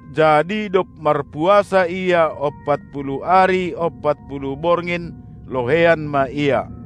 Jadi dob marpuasa Ia ompat puluh ari ompat puluh borngin, loheian ma Ia.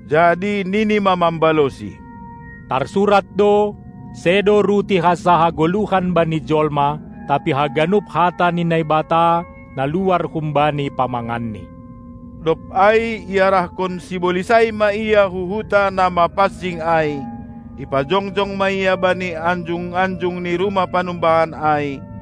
Jadi nini ma mambalosi: Tarsurat do: Sedo ruti hansa hagoluhan bani jolma, tapi haganup hata ni Naibata, na luar humbani pamanganNi. Dob ai iarahkon sibolis ai ma Ia hu huta na mapansing ai, ipajongjong ma Ia bani anjung-anjung ni rumah panumbahan ai,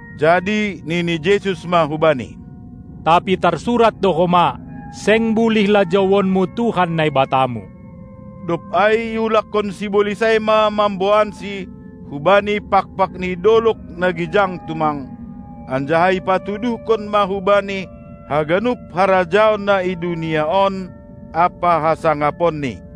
Jadi nini Jesus ma hubani: Tapi tarsurat do homa: Seng bulih lajouonmu Tuhan Naibatamu! Dob ai iulakkon sibolis ai ma mamboansi hubani pakpak ni dolog na gijang tumang, anjaha ipatuduhkon ma hu-Bani haganup harajaon na i dunia on ampa hasangaponni.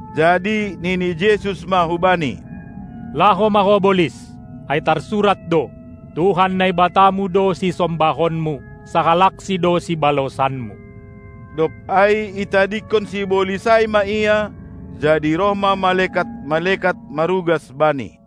Jadi nini Jesus ma hubani: Laho ma ho bolis! Ai tarsurat do: Tuhan Naibatamu do sisombahonmu, sahalaksi do sibalosanmu! Dob ai itadingkon sibolis ai ma Ia, jadi roh ma malekat-malekat marugas Bani.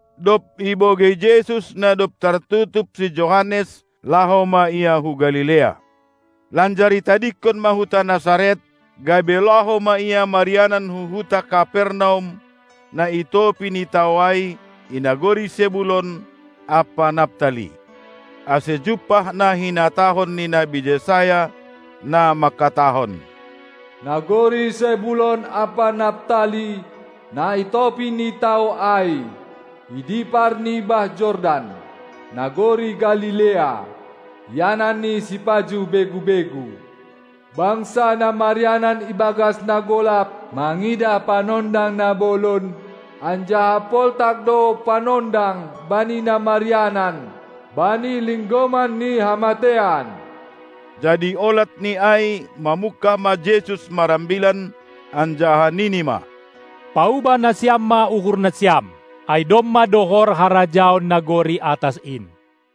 Dob ibogei Jesus na dob tartutup si Johannes, laho ma Ia hu Galilea. Lanjar itadingkon ma huta Nasaret, gabe laho ma Ia marianan hu huta Kapernaum, na i topi ni tao ai, i nagori Sebulon ampa Naptali, ase jumpah na hinatahon ni nabi Jesayas, na mangkatahon: Nagori Sebulon ampa Naptali, na i topi ni tao ai, i dipar ni bah Jordan, nagori Galilea, ianan ni sipajuh begu-begu, bangsa na marianan ibagas na golap mangidah Panondang na bolon, anjaha poltak do Panondang bani na marianan bani linggoman ni hamateian. Jadi olat ni ai mamungkah ma Jesus marambilan, anjaha nini ma: Paubah nasiam ma uhurnasiam, ai domma dohor harajaon nagori atas in!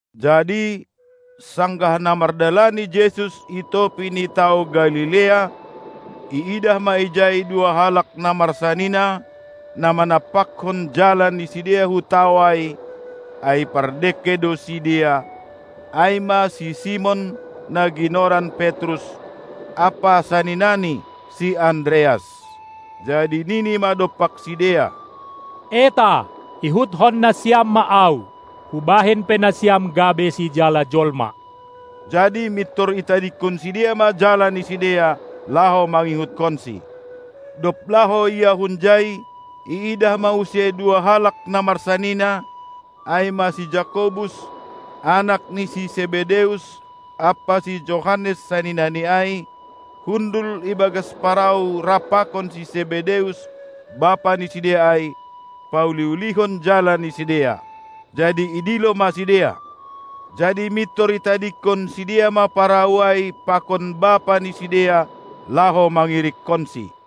Jadi, sanggah na mardalani Jesus i topi ni tao Galilea, iidah ma ijai dua halak na marsanina, na manampakkon jala ni sidea hu tao ai, ai pardengke do sidea, ai ma si Simon, na ginoran Petrus, ampa saninani si Andreas. Jadi nini ma dompak sidea: Eta, ihutkon nasiam ma Ahu, hubahen pe nasiam gabe sijala jolma! Jadi mintor itadingkon sidea ma jala ni sidea, laho mangihutkonSi. Dob laho Ia hunjai, iidah ma use dua halak na marsanina, ai ma si Jakobus, anak ni si Sebedeus, ampa si Johannes saninani ai, hundul ibagas parau rap pakon si Sebedeus, bapa ni sidea ai, pauli-ulihon jala ni sidea. Jadi idilo ma sidea. Jadi mintor itadingkon sidea ma parau ai pakon bapa ni sidea, laho mangirikkonSi.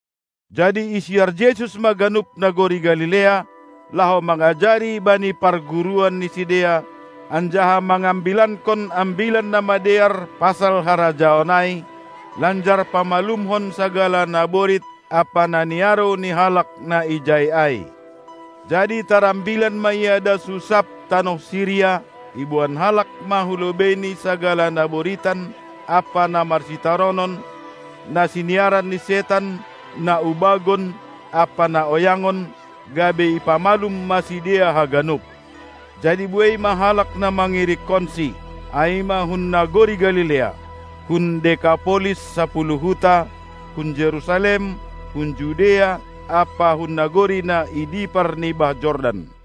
Jadi isiar Jesus ma ganup nagori Galilea, laho mangajari bani parguruan ni sidea, anjaha mangambilankon Ambilan Namadear pasal harajaon ai, lanjar pamalumhon sagala naborit ampa na niarou ni halak na ijai ai. Jadi tarambilan ma Ia das hu sab tanoh Siria; iboan halak ma hu lobeiNi sagala na boritan ampa na marsitaronon, na siniaran ni setan, na ubagon ampa na oyangon, gabe ipamalum ma sidea haganup. Jadi buei halak na mangirikkonSi, ai ma hun nagori Galilea, hun Dekapolis (Sapuluh huta), hun Jerusalem, hun Judea ampa hun nagori na i dipar ni bah Jordan.